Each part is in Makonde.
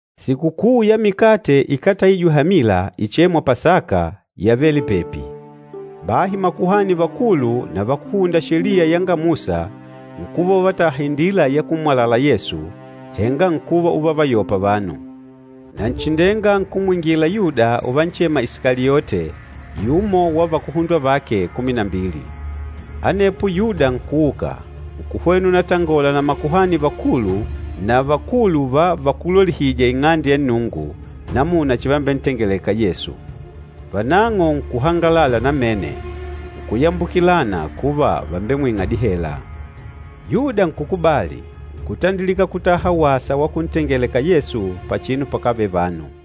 Sikukuu ya Mikate Ikátaijwe Hamila, ichêmwa Pasaka yavele pepi. Bahi makuhani vakulu na vakúhunda Sheliya yanga Musa nkuva uvataha indila ya kummwalala Yesu, henga nkuva uvavayopa vanu. Nanchindenga nkumwingila Yuda uvanchema Isikaliote, yumo wa vakuhundwa vake kumi na mbili. Anepo Yuda nkuuka, nkuhwena unatangola na makuhani vakulu na vakulu va vakúlolihija Ing'ande ya Nnungu, namuna chambentengeleka Yesu. Vanang'o nkuhangalala namene, nkuyambukilana kuva vàmbemwing'a dihela. Yuda nkukubali, nkutandilika kutaha wasa wa kuntengeleka Yesu pachinu pakávele vanu.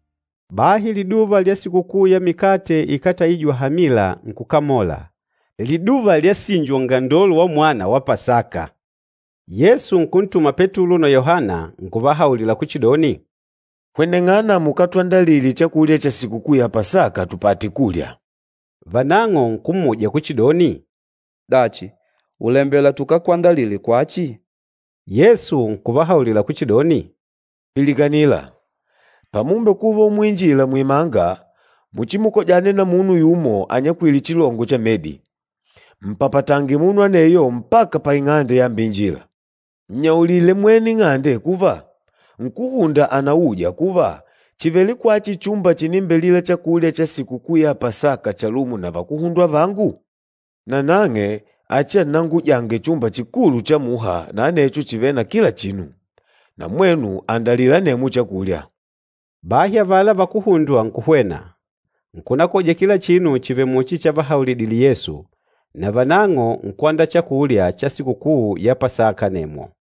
Bahi liduva lya Sikukuu ya Mikate Ikátaijwe Hamila nkukamola, liduva lyasinjwa ungandolo wamwana wa Pasaka. Yesu nkuntuma Petulo na Yohana, nkuvahaulila kuchidoni, “Hweneng'ana mukatwandalile chakulya cha Sikukuu ya Pasaka tupate kulya.” Vanang'o nkummuja kuchidoni, “Dachi, ùlembela tukakwandalile kwachi?” Yesu nkuvahaulila kuchidoni, “Pilikanila! Pamumbekuva umuinjila muimanga, muchimukojane na munu yumo anyakwîle chilongo cha medi. Mpapatange munu aneyo mpaka paing'ande yambeinjila. Nnyaulile mwene ing'ande kuva, ‘Nkúhunda ànauja kuva, chìvele kwachi chumba chinimbelila chakulya cha Sikukuu ya Pasaka chalumo na vakuhundwa vangu?’ Nanang'e achiannangujange chumba chikulu cha muha na anecho chìvele na kila chinu, na mwenu andalila anemwo chakulya.” Bahi avala vakuhundwa nkuhwena, nkunakoja kila chinu chivèlè muchi chavahaulidile Yesu, na vanang'o nkwandaa chakulya cha Sikukuu ya Pasaka anemwo.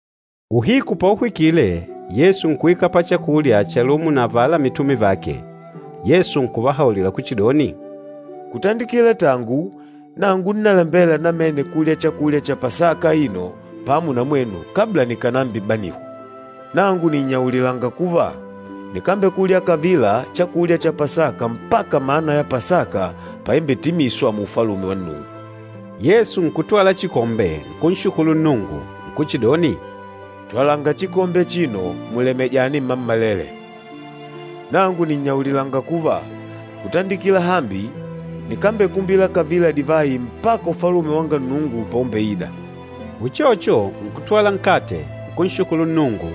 Uhiku pauhwikile, Yesu nkuikala pachakulya chalumo na avala mitume vake. Yesu nkuvahaulila kuchidoni, “Kutandikila tangu nangu nnalembela namene kulya chakulya cha Pasaka aino pamo na mwenu kabla nikànambibanihwa. Nangu nìnnyaulilanga kuva, nikambekulya kavila chakulya cha Pasaka mpaka mana ya Pasaka paimbetimiswa mu Ufalume wa Nnungu.” Yesu nkutwala chikombe, nkunshukulu Nnungu, nkuchidoni, “Twalanga chikombe achino mulemejane mmammalele. Nangu nìnnyaulilanga kuva, kutandikila hambi, nikambekumbila kavila divayi mpaka Ufalume wanga Nnungu paumbeida.” Uchocho, nkutwala nkate, nkunshukulu Nnungu,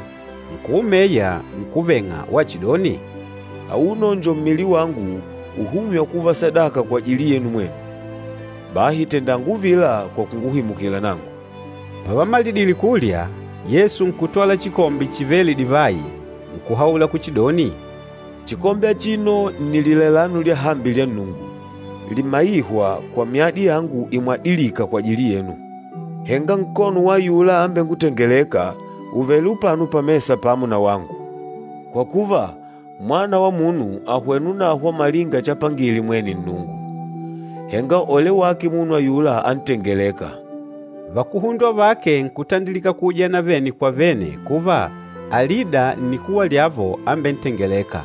nkuumeya nkuveng'a wachidoni, “Auno njo mmili wangu uhûmywa kuva sadaka kwajili yenu mwenu. Bahi tendanga uvila kwa kunguhimukila nangu.” Pavamalidile kulya, Yesu nkutwala chikombe chivêle divayi nkuhaula kuchidoni, “Chikombe achino nni lilailano lyahambi lya Nnungu, limaîhwa kwa myadi yangu imwadilîka kwajili yenu. Henga nkono wa ayula ambengutengelêka ùvele upano pamesa pamo wangu. Kwa kuva, Mwana wa Munu àhwena unahwa malinga chapangile mwene Nnungu, henga ole wake munu ayula antengelêka!” Vakuhundwa vake nkutandilika kuujana vene kwa vene kuva alida nnikuwa lyavo ambentengelêka.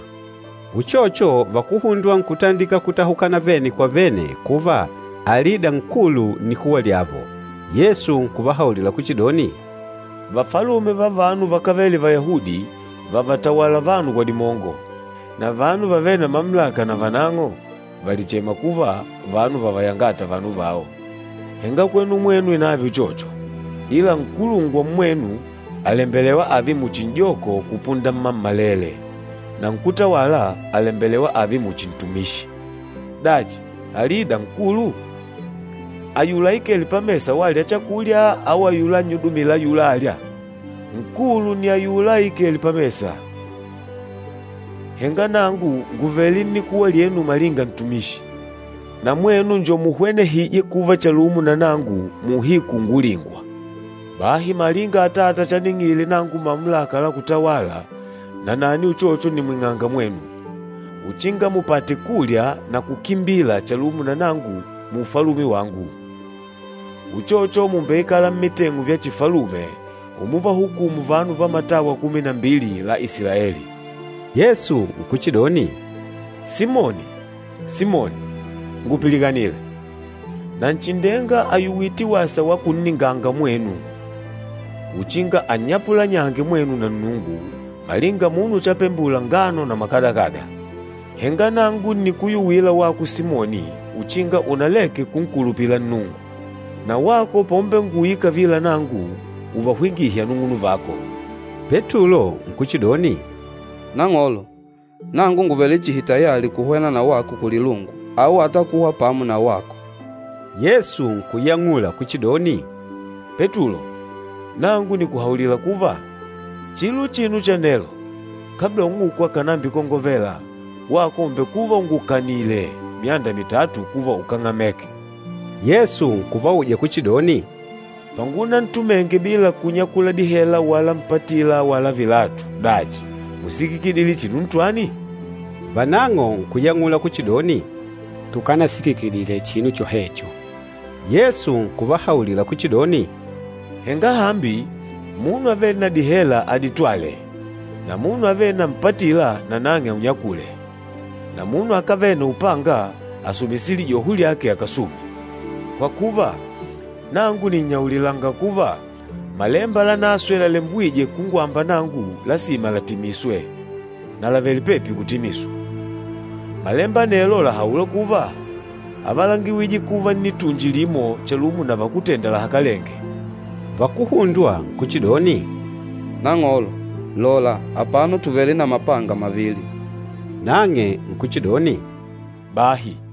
Uchocho vakuhundwa nkutandilika kutahukana vene kwa vene kuva alida nkulu nnikuwa lyavo. Yesu nkuvahaulila kuchidoni, “Vafalume va vanu vakávele Vayahudi vàvatawala vanu kwa dimongo, na vanu vavêle na mamulaka navanang'o vàlichema kuva, ‘Vanu vavayangâta vanu vao.’ Henga kwenu mwenu inave uchocho. Ila nkulungwa mmwenu àlembelewa ààve muchi n'joko kupunda mmammalele, na nkútawala àlembelewa ààve muchi ntumishi. Dachi, alida nkulu? Ayula aikêle pamesa walya chakulya au ayula annyudumîla ayula âlya? Nkulu nni ayula aikêle pamesa. Henga nangu ngùvele nnikuwa lyenu malinga ntumishi. Na mwenu njo muhwenehîje kuva chalumo na nangu muuhiku ungulingwa. Bahi malinga Atata chaning'ile nangu mamulaka la kutawala, nanani uchocho nìmwing'anga mwenu, uchinga mupate kulya na kukimbila chalumo na nangu mu Ufalume wangu. Uchocho, mùmbeikala mmiteng'u vya chifalume umuvahukumu vanu va matawa kumi na mbili la Isilaeli.” Yesu nkuchidoni, “Simoni, Simoni, ngupilikanile! Nanchindenga àyuwite wasa wa kunninganga mwenu uchinga annyapulanyange mwenu na Nnungu malinga munu chapepeta ngano na mahahi. Henga nangu ǹnikuyuwila wako Simoni uchinga unaleke kunkulupila Nnungu. Na wako paumbenguuyila kavila nangu, uvahwingihe anung'unuvako.” Petulo nkuchidoni, “Nang'olo, nangu ngùvele chihi tayali kuhwena na wako kulilungu au ata kuhwa pamo na wako.” Yesu nkuyang'ula kuchidoni, “Petulo nangu nìkuhaulila kuva, chilo uchino cha nelo, kabla ung'uku akànambikongovela, wako ùmbekuva ungukanìlè myanda mitatu kuva ukáng'ameka.” Yesu nkuvauja kuchidoni, “Pangunantumenge bila kunyakula dihela wala mpatila wala vilatu, dachi músikikidile chinu ntwani?” Vanang'o nkuyang'ula kuchidoni, “Tukanasikikidile chinu chohecho.” Yesu nkuvahaulila kuchidoni, “Henga hambi, munu avêle na dihela aditwale na munu avêle na mpatila nanang'e aunyakule, na munu akávele na upanga asumise lijoho lyake akasume. Kwa kuva, nangu nìnnyaulilanga kuva, Malemba Lanaswe lalembwîje kungwamba nangu lasima latimiswe, na làvele pepi kutimiswa. Malemba anelo làhaula kuva, ‘Ávalangiwije kuva nnitunji limo chalumo na vakútenda lahakalenge.’” Vakuhundwa nkuchidoni, “Nang'olo, lola apano tùvele na mapanga mavili.” Nang'e nkuchidoni, “Bahi!”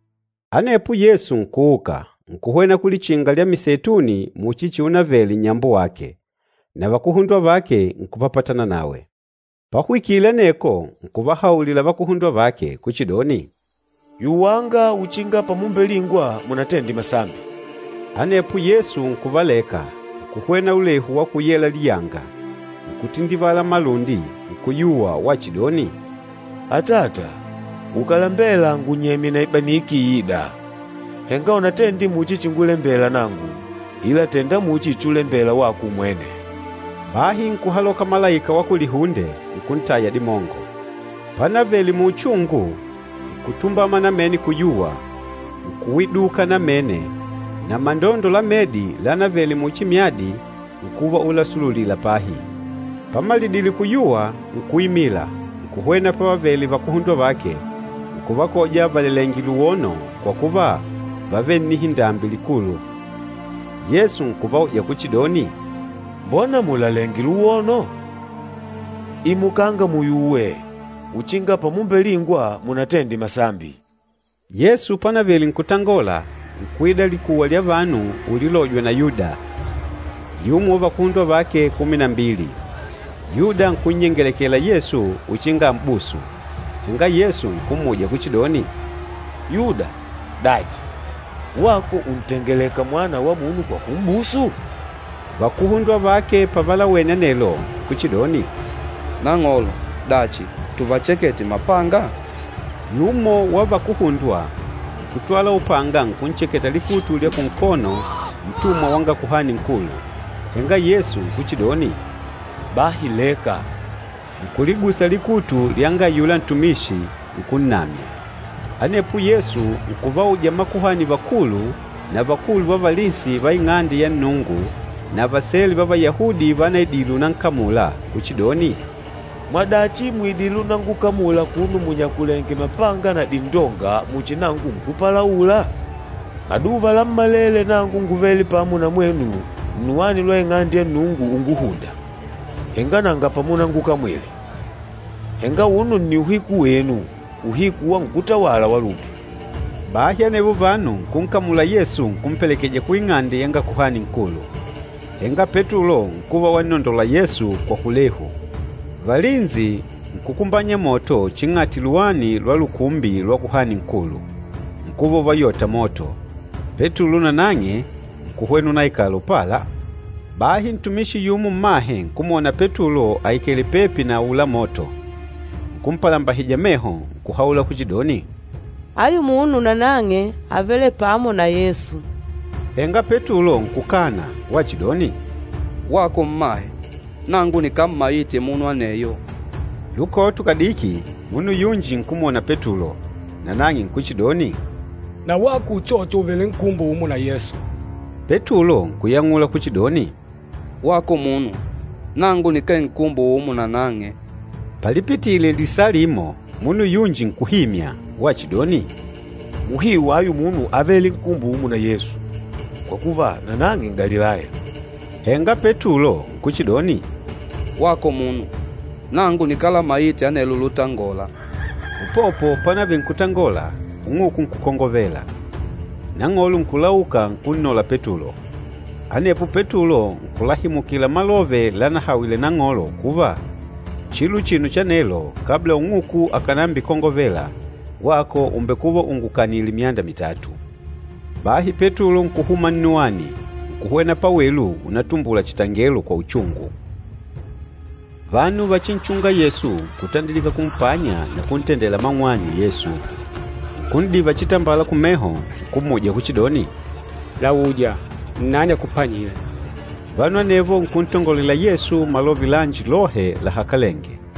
Anepo Yesu nkuuka, nkuhwena ku Lichinga lya Miseituni muchi chiunavele nnyambo wake, na vakuhundwa vake nkupapatana nawe. Pahwikile aneko nkuvahaulila vakuhundwa vake kuchidoni, “Yuwanga, uchinga pamumbelingwa munatende masambi.” Anepo Yesu nkuvaleka, nkuhwena ulehu wa kuyela liyanga, nkutindivala malundi, nkuyuwa wachidoni, “Atata, ukàlambela ngunyemye na ibaniki iîda! Henga unatende muchi chingulembela nangu, ila tènda muchi chulembela wako umwene.” Bahi nkuhaloka malaika wa kulihunde, nkuntaya dimongo. Panavele muuchungu, nkutumbama namene kuyuwa, nkuwiduka namene na mandondo la medi lánavele muchi myadi nkuva ulasululila pahi. Pamalidile kuyuwa, nkuimila, nkuhwena pavavele vakuhundwa vake, nkuvakoja valelèngè luwono kwa kuva, vávele na nnihindambi likulu. Yesu nkuvauja kuchidoni, “Mbona mùlalenge luwono? Imukanga muyuwe, uchinga pamumbelingwa munatende masambi.” Yesu panavele nkutangola, nkuida likuwa lya vanu ulilojwa na Yuda, yumo wa vakuhundwa vake kumi na mbili. Yuda nkunnyengelekela Yesu uchinga àm'busu. Henga Yesu nkummuja kuchidoni, “Yuda, dachi, wako ùntengeleka Mwana wa Munu kwa kum'busu?” Vakuhundwa vake pavalawene anelo nkuchidoni, “Nang'olo, dachi tuvachekete mapanga?” Yumo wa vakuhundwa, nkutwala upanga nkuncheketa likutu lya kunkono ntumwa wanga Kuhani Nkulu. Henga Yesu nkuchidoni, “Bahi leka.” Nkuligusa likutu lyanga ayula ntumishi, nkunnamya. Anepo Yesu nkuvauja makuhani vakulu na vakulu va valinsi va Ing'ande ya Nnungu na vasele va Vayahudi vanaidile unankamula kuchidoni, “Mwadachi mùidile unangukamula akuno munyakulèngè mapanga na dindonga muchi nangu nkúpalaula? Maduva lammalele nangu ngúvele pamo na mwenu nnuwani lwa Ing'ande ya Nnungu unguhùndà, henga nanga pamunangukamwile. Henga auno nni uhiku wenu, uhiku wa nkútawala wa lupi.” Bahi anevo vanu nkunkamula Yesu nkumpelekeja kuing'ande yanga Kuhani Nkulu. Henga Petulo nkuva wannondola Yesu kwa kulehu. Valinsi nkukumbanya moto ching'ati luwani lwa lukumbi lwa kuhani nkulu, nkuva uvayota moto, Petulo nanang'e nkuhwena unaikala upala. Bahi ntumishi yumo mmahe nkumwona Petulo aikèlè pepi na aula moto, nkumpalambahija meho, nkuhaula kuchidoni, “Ayu munu nanang'e ávele pamo na Yesu.” Henga Petulo nkukana wachidoni, “Wako mmahe, nangu nikámmaite munu aneyo!” Lukoto kadiki, munu yunji nkumwona Petulo, nanang'e nkuchidoni, “Na wako uchocho ùvele nkumbo umo na Yesu.” Petulo nkuyang'ula kuchidoni, “Wako munu, nangu nikee nkumbo umo nanang'e!” Palipitile lisaa limo, munu yunji nkuhimya wachidoni, “Muhiu ayu munu ávele nkumbo umo na Yesu, kwa kuva, nanang'e N'galilaya.” Henga Petulo nkuchidoni, “Wako munu, nangu nikálamaite anelo lutangola!” Upopo panavele nkutangola, ung'uku nkukongovela. Nang'olo nkulauka, nkunnola Petulo. Anepo Petulo nkulahimukila malove lanahawile Nang'olo kuva, “Chilo uchino cha nelo, kabla ung'uku akànambikongovela, wako ùmbekuva ungukanìlè myanda mitatu.” Bahi Petulo nkuhuma nnuwani, nkuhwena pawelu unatumbula chitangelo kwa uchungu. Vanu vachinchûnga Yesu nkutandilika kumpanya na kuntendela mang'wanyu Yesu. Nkun'diva chitambala kumeho, nkummuja kuchidoni, “Lauja, nnani akupanyîle!” Vanu anevo nkuntongolela Yesu malove lanji lohe lahakalenge.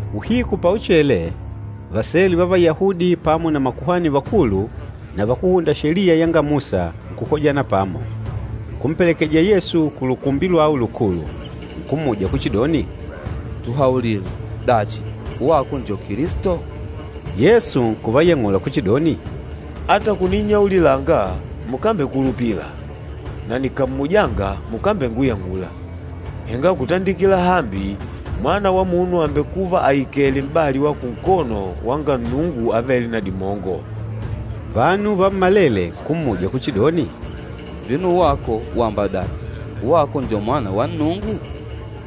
Uhiku pauchele, vasele va Vayahudi pamo na makuhani vakulu na vakúhunda Sheliya yanga Musa nkukojana pamo. Nkumpelekeja Yesu ku Lukumbi lwao Lukulu. Nkummuja kuchidoni, “Tuhaulile, dachi, wako njo Kilisto?” Yesu nkuvayang'ula kuchidoni, “Ata kuninnyaulilanga, mukambengukulupila, na nikàmmujanga mukambenguyang'ula. Henga kutandikila hambi, Mwana wa Munu àmbekuva aikèlè m'bali wa kunkono wanga Nnungu Avêle na Dimongo.” Vanu vammalele nkummuja kuchidoni, “Vino wako wamba dachi, wako njo Mwana wa Nnungu?”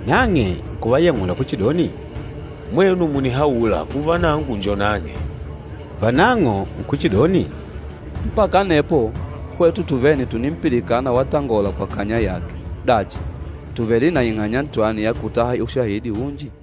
Nang'e nkuvayang'ula kuchidoni, “Mwenu mùnihaula kuva nangu njo nang'e.” Vanang'o nkuchidoni, “Mpaka anepo hwetu tuvene tùnimpilikana watangola kwa kanya yake. Dachi, tùvele na ing'anya ntwani ya kutaha ushahidi unji?”